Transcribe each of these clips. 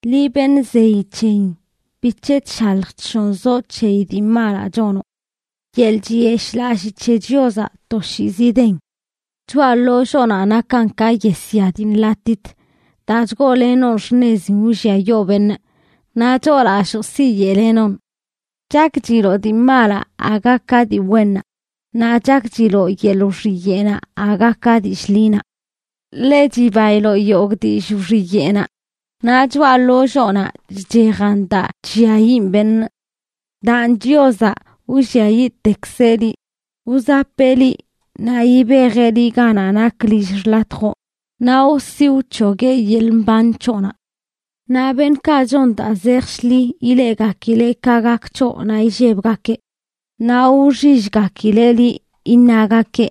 Liꞌ beṉꞌ zeyi c̱heyin, ¿bic̱he chshalj chshonzoꞌ c̱heyi dii malaꞌ chonoꞌ? Yeḻꞌ chiyeshꞌlallii c̱he Chiozaꞌ toshiizi den. Choꞌa ḻolloonaꞌ nakan ka yesya dii nḻatit daa chgoolenoꞌn xṉezin wlliayoo beṉꞌ, naꞌ choolalloo siyeꞌlenoꞌn. Chakchiloꞌ dii malaꞌ aga ka dii wennaꞌ, naꞌ chakchiloꞌ yeḻꞌ wxiyeꞌnaꞌ aga ka dillꞌ ḻinaꞌ. Ḻe chibailoꞌ yogꞌ dillꞌ wxiyeꞌnaꞌ, naꞌ choꞌa ḻolloonaꞌ chchejan daa chlliayiꞌn beṉꞌ. Daan, Chiozaꞌ wlliayiꞌtekzeꞌ liꞌ. Wzapeꞌ liꞌ, naꞌ yibejeꞌ liꞌ ganaꞌ nak lill xḻatjoꞌ, naꞌ wsi wc̱hogueꞌ yeḻꞌ mban c̱hoꞌnaꞌ. Naꞌ beṉꞌkaꞌ chon daa zej shḻi ileꞌgakileꞌ ka gak c̱hoꞌ naꞌ illebgakeꞌ; naꞌ wxillgakileꞌ liꞌ, iṉagakeꞌ: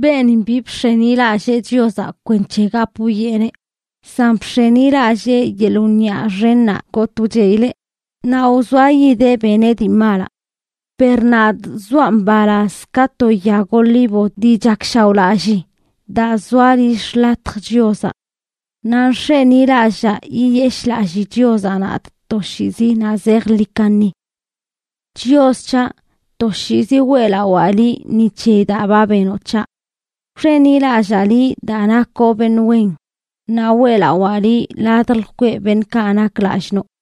“Beenin bi bx̱enilallee Chiozaꞌ kwenc̱he gap wwieꞌneꞌ, san bx̱enilallee yeḻꞌ wniꞌa xennaꞌ gotꞌ wcheꞌileꞌ, naꞌ wzoayideꞌ beneꞌ dii malaꞌ.” Per nadꞌ zoaꞌ mbalaz ka to yag olivo dii chakshaoꞌlallii, daa zoa lill xḻatj Chiozaꞌ. Naꞌ nx̱enilallaa yiyeshꞌlallii Chiozaꞌ nadꞌ toshiizi naꞌ zejḻi kaṉi. Chios c̱haꞌ, toshiizi weꞌlawaa liꞌ ni c̱heyi daa ba benoꞌ c̱haꞌ. Wx̱enilallaa liꞌ daa nakoꞌ beṉꞌ wen, naꞌ weꞌlawaa liꞌ ladj lkweꞌ beṉꞌkaꞌ nak lallꞌ noꞌ.